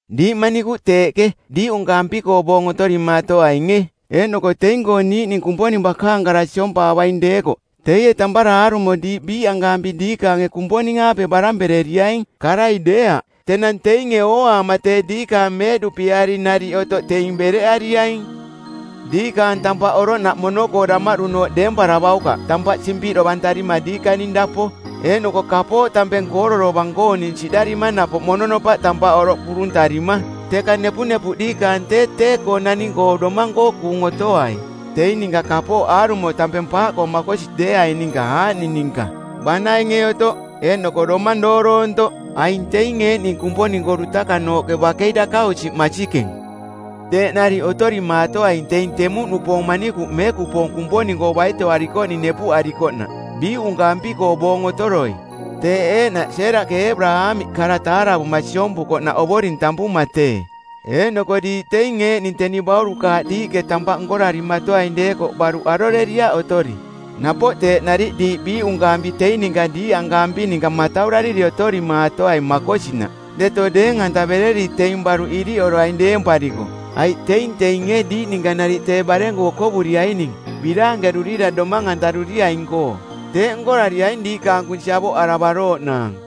Diiꞌ manikuꞌ teeꞌke, diiꞌunkaampi-koo boong otorimaatoainge eeꞌnoko teing-koo niiꞌning Kumponing bakaang kara siompaavaing deekoꞌ teie tampara aarumoi diiꞌ biiꞌankaampi diikaange Kumponing-aape barampereriaing, karai deeaꞌ. Tenang teinge ooaama tee diikaang meeꞌduꞌpiari nariꞌ otoꞌ teing bereꞌariaing. Diikaang tampaꞌ oroꞌnaꞌ mono-koo damaꞌdunooꞌ deemparavaukaꞌ tampaꞌ simpiꞌdovantarima diikaning dapo eeꞌnoko kapooꞌ tampeng kooro dovang-kooning siꞌdarima napoꞌ mononopaꞌ tampaꞌ oroꞌ kuruntarima. Teka nepunepuꞌ diikaang tee tee-koo naning-koo domang-koo kuung otoai teing ninka kapooꞌ aarumo tampeng paaꞌkoo makosi deeaing ninka aaꞌning ninka: banainge otoꞌ eeꞌnoko domang dooroontoꞌ. Aing teing eeꞌning Kumponing-koo dutakanooꞌke bakei dakausiꞌ masikeng. Teeꞌ nariꞌ otorimaatoaing teing temuꞌnupoong manikuꞌ meekupoong Kumponing-koo baitoarikoꞌning nepuꞌarikoꞌnaꞌ biiꞌunkaampi-koo boong otoroi. Teeꞌ eeꞌnaꞌ Seeraꞌke Eebaraamiꞌ kara taaravuma siompukoꞌnaꞌ ovoring tampuma tee. Eeꞌnoko diiꞌ teing eeꞌning teni baurukaaꞌ diiꞌke tampaꞌ nkorarimatoaing deekoꞌ baruꞌ aroreriaꞌ otori. Napoꞌ teeꞌ nariꞌ diiꞌ biiꞌunkaampi teing ninka diiꞌankaampi ninka mataurariri otorimaatoai makosinaꞌ deto deeng-antavereri teing baruꞌ iriꞌoroaing deempariko, aiꞌ teing teinge diiꞌ ninka nariꞌ tee barenku okovuriaining biraankerurira domang-antaruriaing-koo. Teeꞌ nkorariaing diikaang kunsi avoꞌaravarooꞌnaang.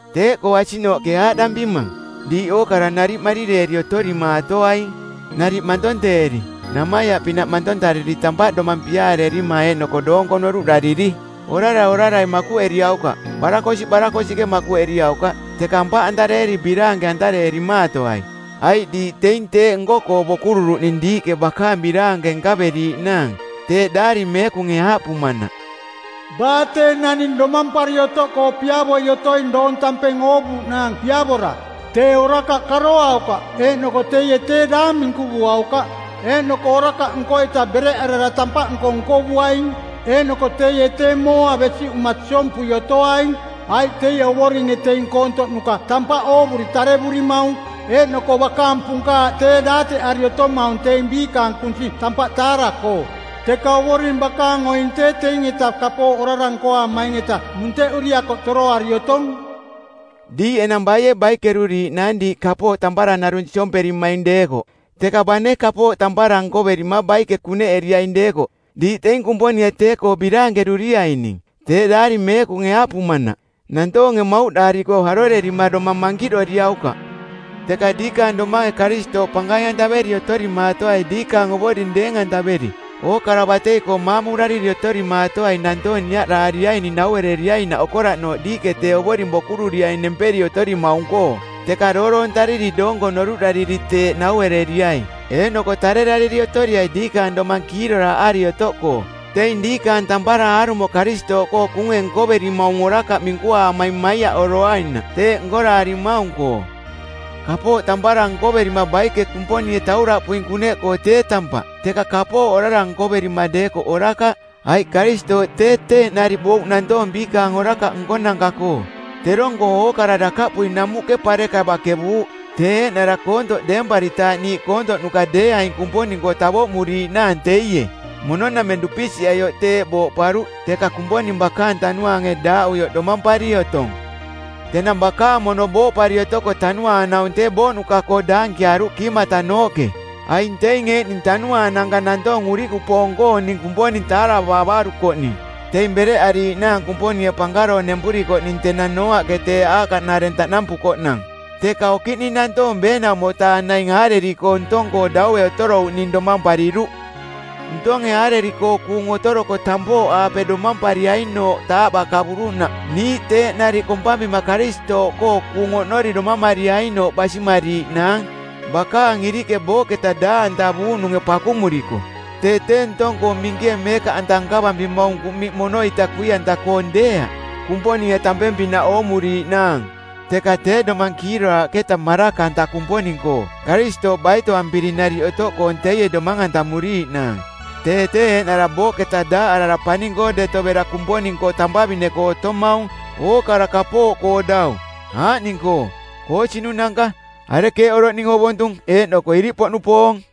Tee-koo asiꞌnooꞌke aaꞌdampimang: Diiꞌ ookara nariꞌ marireeri otorimaatoaing, nariꞌ mantonteeri namaiaꞌpinaꞌ mantontariri tampaꞌ domang piaareerima eeꞌnoko doonko noruꞌdariri. Orara orarai makuꞌeriaukaꞌ, barakosiꞌ barakosiꞌke makuꞌeriaukaꞌ, teka aampariꞌeri biraanke-antareerimaatoai, aiꞌ diiꞌ teing teeꞌ nko-koo bokururuꞌning diiꞌke bakaang biraanke nkaveriiꞌnaang. Teeꞌ Daari Meekunge aaꞌpumanaꞌ, “Baa tee naning domampari otoꞌkoo piavoi otoing doong tampeng oovuuꞌnaang piavora, tee orakaꞌ karoaukaꞌ eeꞌnoko teie tee daang minkuvuaukaꞌ. Eeꞌnoko orakaꞌ nko-eta bereꞌarara tampaꞌnko nkovuaing, eeꞌnoko teie tee mooa besiꞌuma siompui otoaing. Aiꞌ teie Ovoringe teing koontoꞌnuka tampaꞌ oovuri tarevurimaung eeꞌnoko bakaang punkaaꞌ tee daateꞌari otomaung teing biikaang kunsi tampaꞌ taara-koo. Teka Ovoring bakaang oing tee teing-eta kapooꞌ orara nkoaamaing-eta munteꞌuri akoꞌ toroari otong.” Diiꞌ enang baie baikeruriiꞌnaang diiꞌ kapooꞌ tampara narung siomperimaing deekoꞌ? Teka bane kapooꞌ tampara nkoverima baike kuneꞌeriaing deekoꞌ diiꞌ teing Kumponinge tee-koo biraankeruriaining. Teeꞌ Daari Meekunge aaꞌpumanaꞌ, “Nantoonge mauꞌdaariko arorerima domang mankiꞌdoriaukaꞌ.” Teka diikaang domange Karistooꞌ pankaing-antaveri otorimaatoai diikaang Ovoring deeng-antaveri. Ookara batei-koo maamurariri otorimaatoai nantoong niaꞌdaariaining nauereriainaꞌ okoraꞌnooꞌ diiꞌke tee Ovoring bokururiaing nemperi otorimaung-koo, teka dooroontariri doonko noruꞌdariri teeꞌ nauereriai. Eeꞌnoko tarerariri otoriai diikaang domang kiiroraaꞌari otoꞌkoo teing diikaang tampara aarumo Karistooꞌkoo kuunge nkoverimaung orakaꞌ minkuaamaing maiaꞌoroainaꞌ teeꞌ nkoraarimaung-koo. Kapooꞌ tampara nkoverima baike Kumponinge tauraꞌpuing kuneꞌkoo tee tampaꞌ, teka kapooꞌ orara nkoverima deekoꞌ orakaꞌ. Aiꞌ Karistooꞌ tee teeꞌ nariꞌ bouꞌ nantoong biikaang orakaꞌ nkonanka-koo. Terong-koo ookara dakaꞌpui namuꞌke pareka bakevuuꞌ, tee eeꞌnara koontoꞌ deemparitaaꞌ niiꞌ koontoꞌnuka deeaing Kumponing-koo tavoꞌmuriiꞌnaang teie. Mono nameng dupisiꞌaioꞌ teeꞌ booꞌparuꞌ, teka Kumponing bakaang Tanuaange daaꞌuioꞌ domampari otong. Tenang bakaang mono booꞌpari otoko tanuaang-naung tee booꞌnuka-koo daankiaruꞌ kiimatanooꞌke. Aing teing eeꞌning tanuaananka nantoong urikupoong-kooning Kumponing taaravaavarukoꞌ ning, teing bereꞌariiꞌnaang Kumponinge pankaroong nempurikoꞌning tenang Nooaꞌke tee aakaꞌnareng taꞌnampukoꞌnang. Teka okiꞌning nantoong ˜beenaumo-taa naing aareri˜koo ntong-koo daue otorouꞌning domampariruꞌ. Ntonge aareri-koo kuung otoroko tampooꞌaape domampariainooꞌ taaꞌbakavuruꞌnaꞌ niiꞌ teeꞌ nariꞌ kompampima Karistooꞌkoo kuung oꞌnori domamariainooꞌ basimariiꞌnaang bakaang iriꞌke booꞌketa daaꞌantavuuꞌnunge pakumuriko. Tee tee ntong-koo minkie meekaꞌanta nkavampimaung kuꞌmiꞌ mono-ita kui-anta-koong deeaꞌ Kumponinge tampeng-pinaꞌ oomuriiꞌnaang, teka tee domang kiiroraaꞌketa maraka-anta Kumponing-koo Karistooꞌ baitoampiri nariꞌ otoꞌkoong teie domang-antamuriiꞌnaang. Tee tee eeꞌnara booꞌketa daaꞌarara paning-koo deto bera Kumponing-koo tampavine-koo otomaung, ookara kapooꞌkoo dau, aaꞌning-koo: koosinunanka, arekeeꞌ oroꞌning ovontung eeꞌnoko iriꞌpoꞌnupoong.